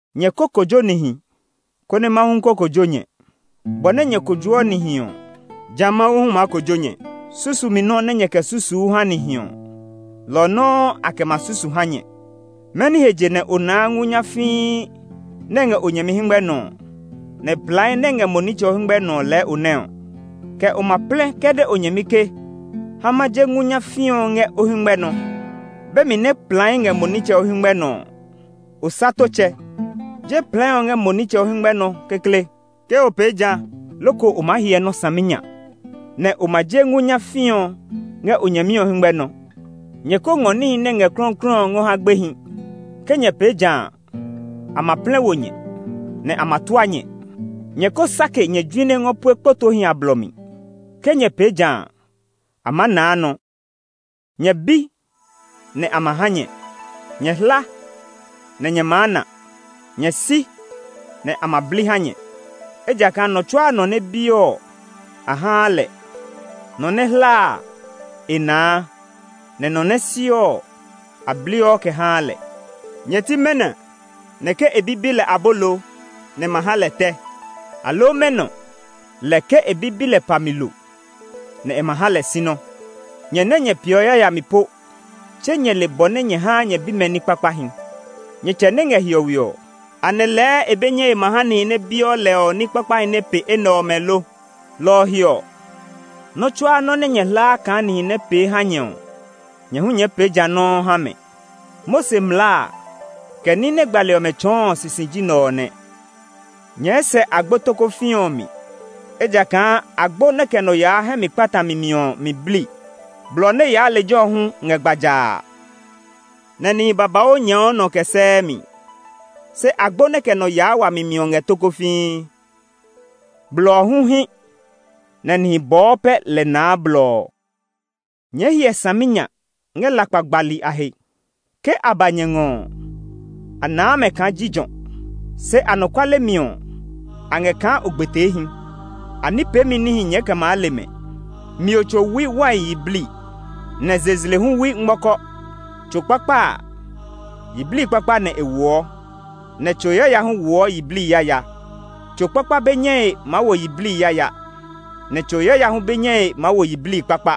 “Nyɛ kó kojo nihi, konɛ Mawu hu kó kojo nyɛ. Bɔ nɛ nyɛ kojoɔ nihi ɔ, jã Mawu hu maa kojo nyɛ. Susumi nɔ́ nɛ nyɛɛ kɛ susuu ha nihi ɔ, lɔ ɔ nɔuu a kɛ ma susu ha nyɛ. Mɛni he je nɛ o naa ngu nyafii nɛ ngɛ o nyɛmi hɛngmɛ nɔ nɛ plai nɛ ngɛ mo nitsɛ o hɛngmɛ nɔ ɔ lɛɛ o nɛ ɔ? Kɛ o ma plɛ kɛ de o nyɛmi ke, ‘Ha ma je ngu nyafii ɔ ngɛ o hɛngmɛ nɔ;’ be mi nɛ plai ngɛ mo nitsɛ o hɛngmɛ nɔ ɔ? Osatotsɛ! Je plai ɔ ngɛ mo nitsɛ o hɛngmɛ nɔ kekle. Ke o pee jã loko o maa hyɛ nɔ́ saminya, nɛ o ma je ngu nyafii ɔ ngɛ o nyɛmi ɔ hɛngmɛ nɔ. “Nyɛ ko ngɔ níhi nɛ ngɛ klɔuklɔu ngɔ ha gbehi; ke nyɛ pee jã a, a ma plɛ wo nyɛ, nɛ a ma tua nyɛ. Nyɛ ko sake nyɛ june ngɔ pue kpotoohi a blɔ mi; ke nyɛ pee jã a, a maa naa nɔ. “Nyɛ bi, nɛ a ma ha nyɛ; nyɛ hla, nɛ nyɛ maa na; nyɛ si, nɛ a ma bli sinya a ha nyɛ. Ejakaa nɔ tsuaa nɔ nɛ biɔ ɔ, a haa lɛ; nɔ nɛ hlaa a, e naa; nɛ nɔ nɛ siɔ sinya a, a bliɔ kɛ haa lɛ. Nyɛ ti mɛnɔ nɛ ke e bi bi lɛ abolo nɛ e ma ha lɛ tɛ? Aloo mɛnɔ lɛ ke e bi bi lɛ pa mi lo nɛ e ma ha lɛ sinɔ? Nyɛ nɛ nyɛ peeɔ yayami po, tse nyɛ le bɔ nɛ nyɛ haa nyɛ bimɛ ní kpakpahi! Nyɛ Tsɛ nɛ ngɛ hiɔwe ɔ, anɛ lɛɛ e be nyɛe ma ha nihi nɛ biɔ lɛ ɔ ní kpakpahi nɛ pe enɛ ɔmɛ lo? “Lɔ ɔ he ɔ, nɔ́ tsuaa nɔ́ nɛ nyɛ hlaa kaa nihi nɛ pee ha nyɛ ɔ, nyɛ hu nyɛɛ pee ja nɔuu ngɔ ha mɛ. Mose mlaa a, kɛ ní nɛ gbali ɔmɛ tsɔɔ ɔ sisi ji nɛ ɔ nɛ. “Nyɛɛ sɛ agbo tokofii ɔ mi, ejakaa agbo nɛ kɛ nɔ yaa hɛ mi kpatami mi ɔ mi bli. Blɔ nɛ yaa lejɛ ɔ hu ngɛ gbajaa, nɛ nihi babauu nyɛɛɔ nɔ kɛ sɛɛ mi. Se agbo nɛ kɛ nɔ yaa wami mi ɔ ngɛ tokofii; blɔ ɔ hu hí, nɛ nihi bɔɔ pɛ lɛ naa blɔ ɔ. “Nyɛɛ hyɛ saminya ngɛ lakpa gbali a he. Ke a ba nyɛ ngɔ ɔ, a naa mɛ kaa jijɔ, se anɔkuale mi ɔ, a ngɛ kaa ogbeteehi; a ní peemi níhi nyɛɛ kɛ maa le mɛ. Mio tso wui wai yiblii, nɛ zezle hu wui ngmɔkɔ. Tso kpakpa a, yiblii kpakpa nɛ e woɔ, nɛ tso yaya hu woɔ yiblii yaya. Tso kpakpa be nyɛe maa wo yiblii yaya, nɛ tso yaya hu be nyɛe maa wo yiblii kpakpa.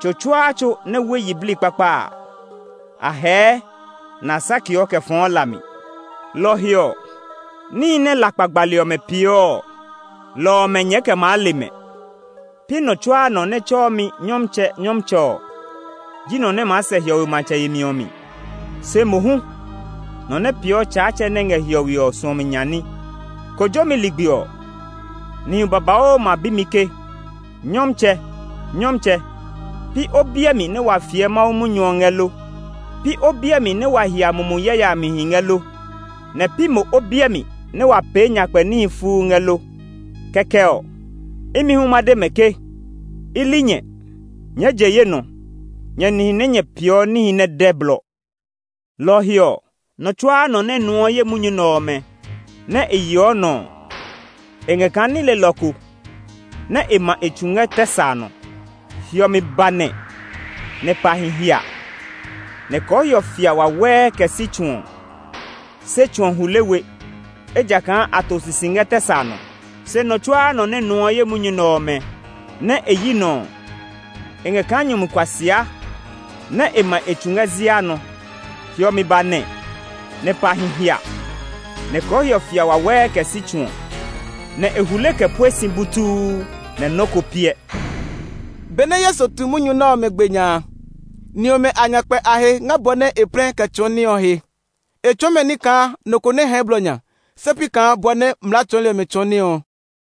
Tso tsuaa tso nɛ wui yiblii kpakpa a, a hɛɛ, nɛ a sakeɔ kɛ fɔɔ la mi. Lɔ ɔ he ɔ, níhi nɛ lakpa gbali ɔmɛ peeɔ ɔ, lɔ ɔmɛ nyɛɛ kɛ maa le mɛ. “Pi nɔ tsuaa nɔ nɛ tsɛɔ mi ‘Nyɔmtsɛ, Nyɔmtsɛ’ ɔ ji nɔ nɛ maa sɛ hiɔwe matsɛ yemi ɔ mi; se mohu nɔ nɛ peeɔ Tsaatsɛ nɛ ngɛ hiɔwe ɔ suɔmi nya ní. Kojomi ligbi ɔ, nihi babauu ma bi mi ke, ‘Nyɔmtsɛ, Nyɔmtsɛ! Pi o biɛ mi nɛ wa fiɛ Mawu munyu ɔ ngɛ lo? Pi o biɛ mi nɛ wa hia mumi yayamihi ngɛ lo? Nɛ pi mo o biɛ mi nɛ wa pee nyakpɛ ní fuu ngɛ lo?’ Kɛkɛ ɔ, imi hu ma de mɛ ke, ‘I li nyɛ! Nyɛɛ je ye nɔ, nyɛ nihi nɛ nyɛ peeɔ níhi nɛ dɛ blɔ!’ “Lɔ ɔ he ɔ, nɔ tsuaa nɔ nɛ nuɔ ye munyu nɛ ɔmɛ, nɛ e yeɔ nɔ ɔ, e ngɛ kaa ní lelɔ ko nɛ ma e tsu ngɛ tɛ sa nɔ. Hiɔmi ba nɛ, nɛ pahi hia, nɛ kɔɔhiɔ fia wawɛɛ kɛ si tsu ɔ. Se tsu ɔ hule we, ejakaa a to sisi ngɛ tɛ sa nɔ. “Se nɔ tsuaa nɔ nɛ nuɔ ye munyu nɛ ɔmɛ, nɛ e yi nɔ ɔ, e ngɛ kaa nyumu kuasia nɛ ma e tsu ngɛ zia nɔ. Hiɔmi ba nɛ, nɛ pahi hia, nɛ kɔɔhiɔ fia wawɛɛ kɛ si tsu ɔ. Nɛ e hule kɛ pue si butuu nɛ nɔ́ ko piɛ.” Benɛ Yesu tu munyu nɛ ɔmɛ gbe nya a, ni ɔmɛ a nya kpɛ a he ngɛ bɔ nɛ e plɛ kɛ tsɔɔ ní ɔ he. E tsɔɔ mɛ ní kaa nɔ ko nɛ hɛɛ blɔ nya, se pi kaa bɔ nɛ mlaa tsɔɔli ɔmɛ tsɔɔ ní ɔ.